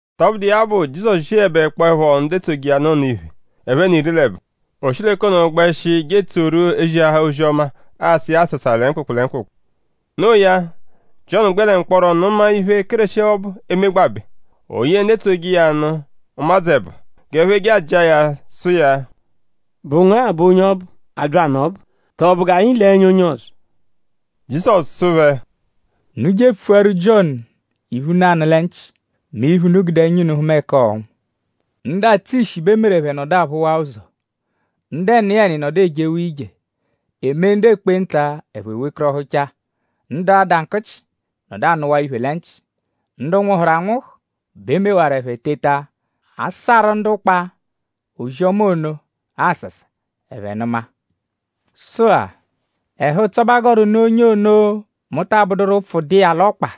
Tọbudu iya bụ; Jizọsu ziẹbekpoepho ndu etsoje iya nụ ono iphe, ẹphe n'iri l'ẹbo; o shi l'ẹka ono gbẹshi je etsoru ziahaa ozi-ọma; asa iya asasa lẹ mkpụkpu lẹ mkpụkpu. Noo ya; Jiọnu gbẹ l'ọka mkpọro nụma iphe, Kéreshi ọbu emegbabẹ. O ye ndu etsoje iya nụ; ụmadzu ẹbo; g'ẹphe je ajịa ya sụ iya: “?Bụ ngu-a bụ onye ọbu, abyanụ ọbu? Tọo?bụ g'anyi le ẹnya onye ọzo?” Jizọsu sụ phẹ: “Unu je epfuaru Jiọnu iphe, unu anụ lẹ nchị; mẹ iphe, unu gude ẹnya unu hụma ẹka ọonwu. Ndu atsụ ishi bẹ e meru ẹphe nọdu aphụwaa ụzo; ndu ẹniyeni nọdu ejewaa ije; e mee ndu ekpenta; ẹphe wekọrohuchaa; ndu ada nkụchi nọdu anụwaa iphe lẹ nchị. Ndu nwụhuru anwụhu bẹ e mewaru ẹphe teta; a saarụ ndu ụkpa ozi-ọma ono asasa; ẹphe nụma. Sụ-a; ẹhu-ụtso bẹ a gọru nụ onye ono, mu taa bụduru ụpfu dụ iya l'ọkpa.”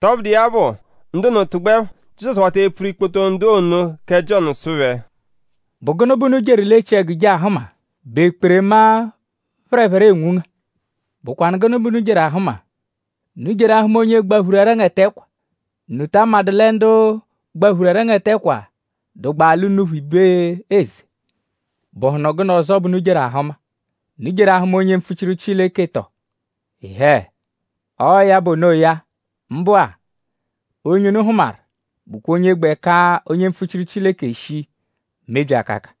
Tọbudu iya bụ; ndu ono tụgbuepho; Jizọsu wata epfuru ikpoto ndu ono kẹ Jiọnu sụ phẹ: “?Bụ gụnu bẹ unu jeru l'echiẹgu je ahụma??Bụ ekperema, phẹrephere enwunga? ?Bụkwanu gụnu bẹ unu jeru ahụma??Unu jeru ahụma onye gbaphuru ẹrengete ẹkwa??Unu ta amadụ lẹ ndu gbaphuru ẹrengete ẹkwa dụgbaa l'unuphu ibe eze? ?Bụhunu gụnu ọzo bẹ unu jeru ahụma??Unu jeru ahụma onye mpfuchiru Chileke tọ? Ịhee! Ọo ya bụ onoya; mbụ-a; onye unu hụmaru bụkwa onye gbẹ ka onye mpfuchiru Chileke shii mebyi akaka.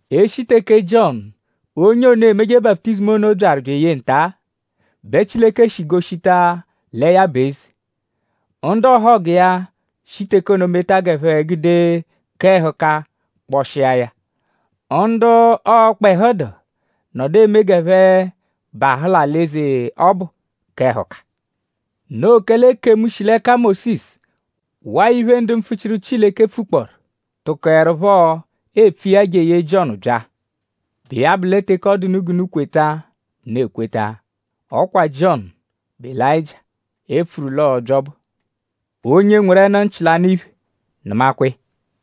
E -shi teke Jiọnu; onye ono emeje baputizimu ono byaru bya eye nta-a bẹ Chileke shi goshita lẹ ya bụ eze; ndu ọhogu iya shi teke ono meta g'ẹphe gude k'ẹhuka kpọshia ya. Ndu ọkpehu dụ; nọdu eme g'ẹphe bahụ l'alị-eze ọbu k'ẹhuka. Noo kẹle ekemu, shi l'ẹka Mósisu waa iphe, ndu mpfuchiru Chileke pfukpọoru; tụkoerupho epfu iya jeye Jiọnu bya. Bụ iya bụ lẹ teke ọ dụ unu g'unu kweta; unu ekweta. Ọ kwa Jiọnu bụ Elayịjia, e pfuru l'ọo-bya ọbu. Onye nweru ẹnu-nchị, l'anụ iphe; nụmakwa iya.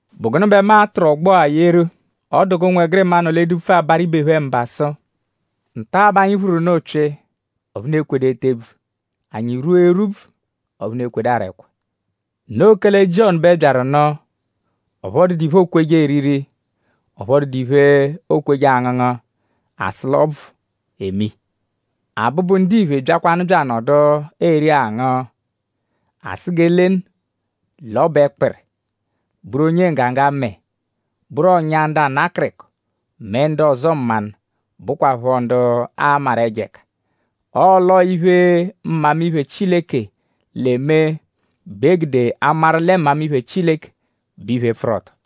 “?Bụ gụnu bẹ mu a-tụru ọgbo-a yeru? Ọ dụ g'ụnwegirima, nọ l'edupfu abarụ ibe phẹ mba sụ: ‘Nta bẹ anyi phụru unu ụpyi; ọphu unu ekwedu ete ebvu; anyi rwua erwubvu; ọphu unu ekwedu ara ẹkwa.’ Noo kẹle Jiọnu bẹ byaru nụ; ọphu ọ dụdu iphe, ookweje eriri; ọphu ọ dụdu iphe, ookweje angụngu; a sụ l'ọo ọbvu eme iya. Abụbu-Ndiphe byakwanụ bya anọdu eri angụ; a sụ g'e lenu l'ọ bụ ẹkpiri; bụru onye nggaga mẹe; bụru ọ̀nyà ndu ana akịriko mẹ ndu ọzo mmanụ, bụkwapho ndu aamaru ẹjo ẹka. Ọle ọo iphe, mmamiphe Chileke l'eme bẹ e gude amaru lẹ mmamiphe Chileke bụ iphe, pfụru ọto.”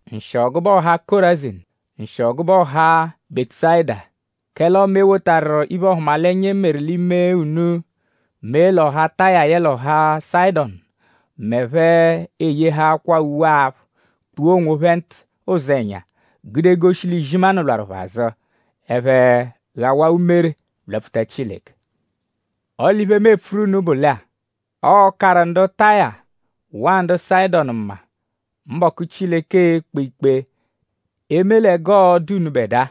“Nshịo gụbe ọha Kọrazinu! Nshịo gụbe ọha Bẹtusayida! Kẹle ọme e wotaru iphe-ọhumalenya, e meru l'ime unu mee l'ọha Taya yẹle ọha Sayịdonu m'ẹphe eyehaakwaa uwe-aphụ; kpua onwophẹ ntụ ụzenya; gude goshi l'izimanụ lwarụ phẹ azụ; ẹphe ghawaa umere lwapfuta Chileke. Ọle iphe, mu epfuru unu bụ lẹ-a: ọo-karụ ndu Taya; waa ndu Sayịdonu mma mbọku, Chileke e-kpe ikpe eme lẹ g'ọo-dụ unubẹdua.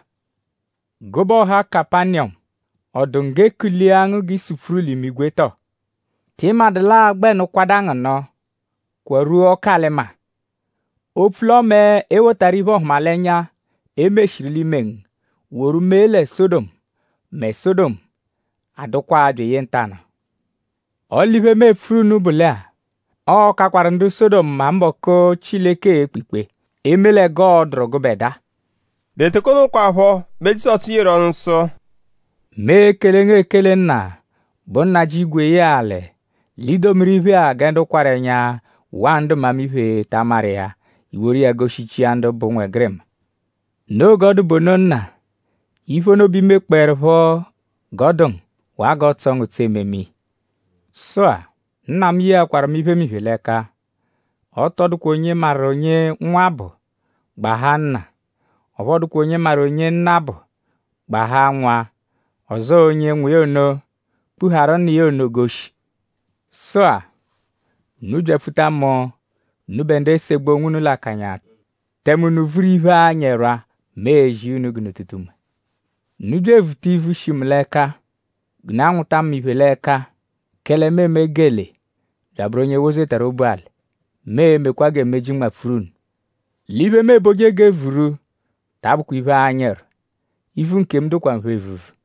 Gụbe ọha Kapaniyọmu!?Ọ dụ ngu g'e kulia ngu g'ị supfuru l'imigwe tọo??Tị madụ l'aa-gbẹnu kwada ngu nụ kwarwua ọku-alị-maa. Opfu l'ọme e wotaru iphe-ọhumalenya, e meshiru l'ime ngu woru mee lẹ Sọdomu; mẹ Sọdomu anọdukwaa byeye ntanụ-a. Ọle iphe, mu epfuru unu bụ lẹ-a: ọo-kakwaru ndu Sọdomu mma mbọku, Chileke e-kpe ikpe eme lẹ g'ọo-dụru gụbedua.” Lẹ teke ono kwaphọ bẹ Jizọsu yeru ọnu sụ: “Mu ekele ngu ekele Nna, bụ Nnajị igwe yẹe alị; l'i domiru iphe-a gẹ ndu kwarụ ẹnya waa ndu mmamiphe ta amaru iya; i woru iya goshichia ndu bụ ụnwegirima. Noo g'ọ dụ bụ ono Nna. Iphe ono bẹ i mekpọerupho g'ọ dụ ngu; waa g'ọotso ngu ụtso ememe iya. “Sụ-a; Nna mu yeakwaru mu iphemiphe l'ẹka. Ọ tọ dụkwa onye maru onye Nwa bụ; gbahaa Nna. Ọphu ọ dụkwa onye maru onye Nna bụ; gbahaa Nwa; ọzo onye Nwa iya ono kpuhaaru Nna iya ono goshi. “Sụ-a; unu byapfuta mu; unubẹ ndu esegbu onwunu l'akanya; tẹme unu vuru iphe, anyị ẹrwa; mu e-zi iya unu g'unu tụta unme. Unu bya evuta ivu, shi mu l'ẹka; g'unu anwụta mu iphe l'ẹka; kẹle mu eme gelee bya abụru onye wozetaru obu alị. Mu e-mekwa gẹ meji nmapfuru unu. L'iphe, mu eboje g'e vuru ta abụkwa iphe, anyị ẹrwa. Ivu nkemu dụkwa nphe evuvu.”